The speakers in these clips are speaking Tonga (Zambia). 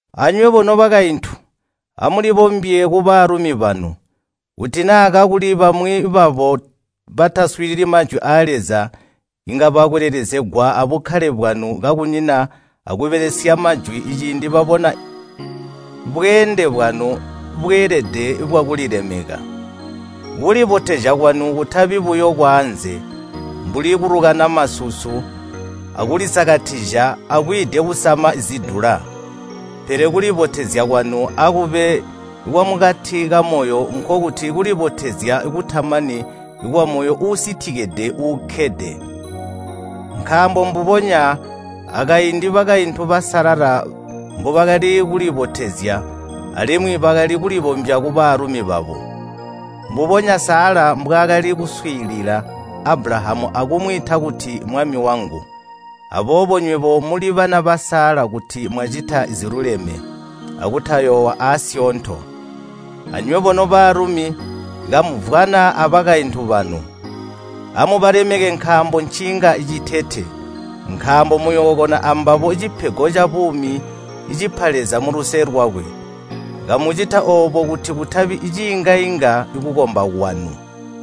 Anywebo nobakaintu, amulibombye kubalumi banu, kuti naa kakuli bamwi babo bataswiilili Majwi aa Leza inga balakwelelezegwa abukkale bwanu kakunyina akubelesya majwi ciindi babona bweende bwanu bweelede bwakulilemeka. Kulibotezya kwanu kutabi buyo kwaanze, mbuli kulukana masusu akulisakatizya akwiide kusama zidula. Pele kulibotezya kwanu akube kwamukati kamoyo nkokuti kulibotezya kutamani kwamoyo uusitikide uukkede. Nkaambo mbubonya akaindi bakaintu basalala mbubakali kulibotezya alimwi bakali kulibombya kubalumi babo. Mbubonya Sala mbwaakali kuswiilila Abulahamu akumwiita kuti, “Mwami wangu.” Aboobo nywebo muli bana ba Sala kuti mwacita ziluleme akutayoowa aasyoonto. Anywebo nobalumi kamumvwana abakaintu banu. Amubalemeke nkaambo nciinga citete. Nkaambo muyookona ambabo cipego cabuumi cipa Leza muluse lwakwe. Kamucita oobo kuti kutabi ciinga-inga kukomba kwanu.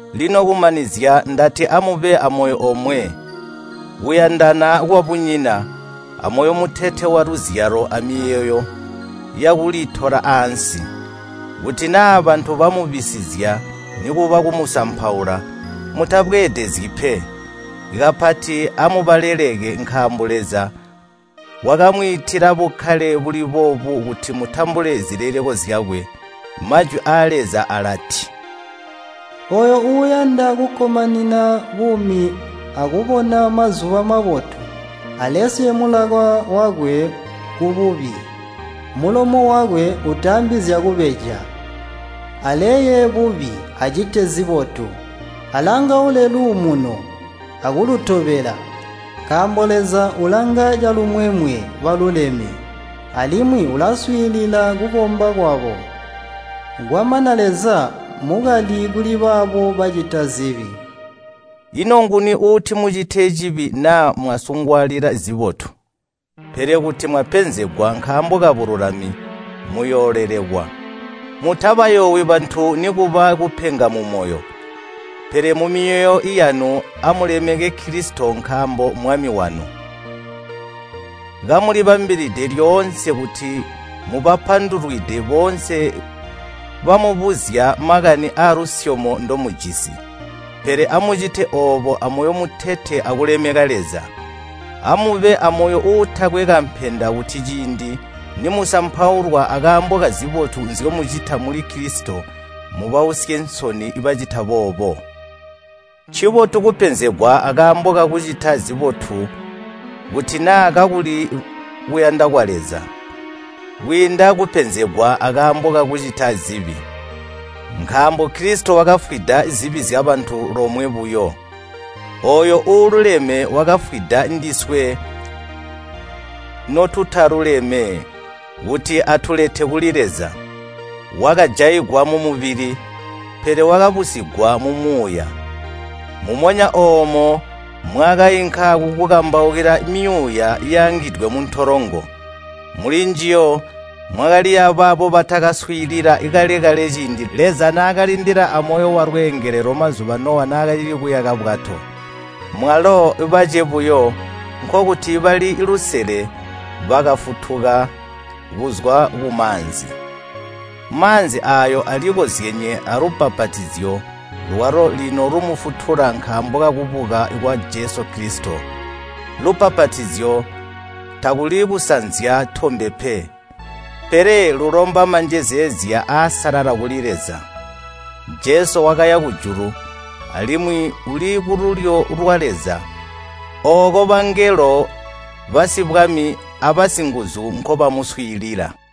Lino kumanizya ndati amube amoyo omwe, kuyandana kwabunyina, amoyo mutete waluzyalo amiyeeyo yakulitola ansi. Kuti naa bantu bamubisizya nikuba kumusampaula, mutabweedezyi pe. Kapati amubaleleke nkaambo Leza wakamwiitila bukkale buli boobu kuti mutambule zileleko zyakwe. Majwi aa Leza alati, “Ooyo uuyanda kukkomanina buumi akubona mazuba mabotu, alesye mulaka wakwe kububi, mulomo wakwe utaambi zyakubeja. Aleye bubi, acite zibotu. Alangaule luumuno akulutobela. Nkaambo Leza ulanga calumwemwe baluleme, alimwi ulaswiilila kukomba kwabo, kwamana Leza mmukali kuli baabo bacita zibi.” Ino nguni uuti mucite cibi naa mwasungwaalila zibotu? Pele kuti mwapenzegwa nkaambo kubululami, muyoolelekwa. Mutabayoowi bantu nikuba kupenga mumoyo. Pele mumyoyo yanu amulemeke Kilisito nkaambo Mmwami wanu. Kamulibambilide lyoonse kuti mubapandulwide boonse bamubuzya makani aalusyomo ndomujisi, pele amucite oobo amoyo mutete akulemeka Leza. Amube amoyo uutakwe kampenda kuti ciindi nimusampaulwa akaambo kazibotu nzyomucita muli Kilisito, mubausye nsoni bacita boobo. Ncibotu kupenzegwa akaambo kakucita zibotu kuti naa kakuli kuyanda kwa Leza, kwiinda kupenzegwa akaambo kakucita zibi. Nkaambo Kilisito wakafwida zibi zyabantu lomwe buyo. Ooyo uululeme wakafwida ndiswe notutaluleme, kuti atulete kuli Leza. Wakajaigwa mumubili, pele wakabusigwa mumuuya. Mumonya oomo mwaakainka kukukambaukila myuuya yaangidwe muntolongo. Mulinjiyo mwakali yabaabo batakaswiilila kale-kale ciindi Leza naakalindila amoyo walweengelelo mazuba Nowa naakacili kuyaka bwato. Mwalo bace buyo, nkokuti bali lusele bakafutuka kuzwa kumaanzi. Maanzi aayo alikozyenye alubbapatizyo lwalo lino lumufutula nkaambo kakubuka kwa Jesu Kilisito. Lubbapatizyo takuli kusanzya tombe pe, pele lulomba manjezeezya aasalala kuli Leza. Jesu wakaya kujulu alimwi uli kululyo lwa Leza. Ooko bangelo, basibwami, abasinguzu nkobamuswiilila.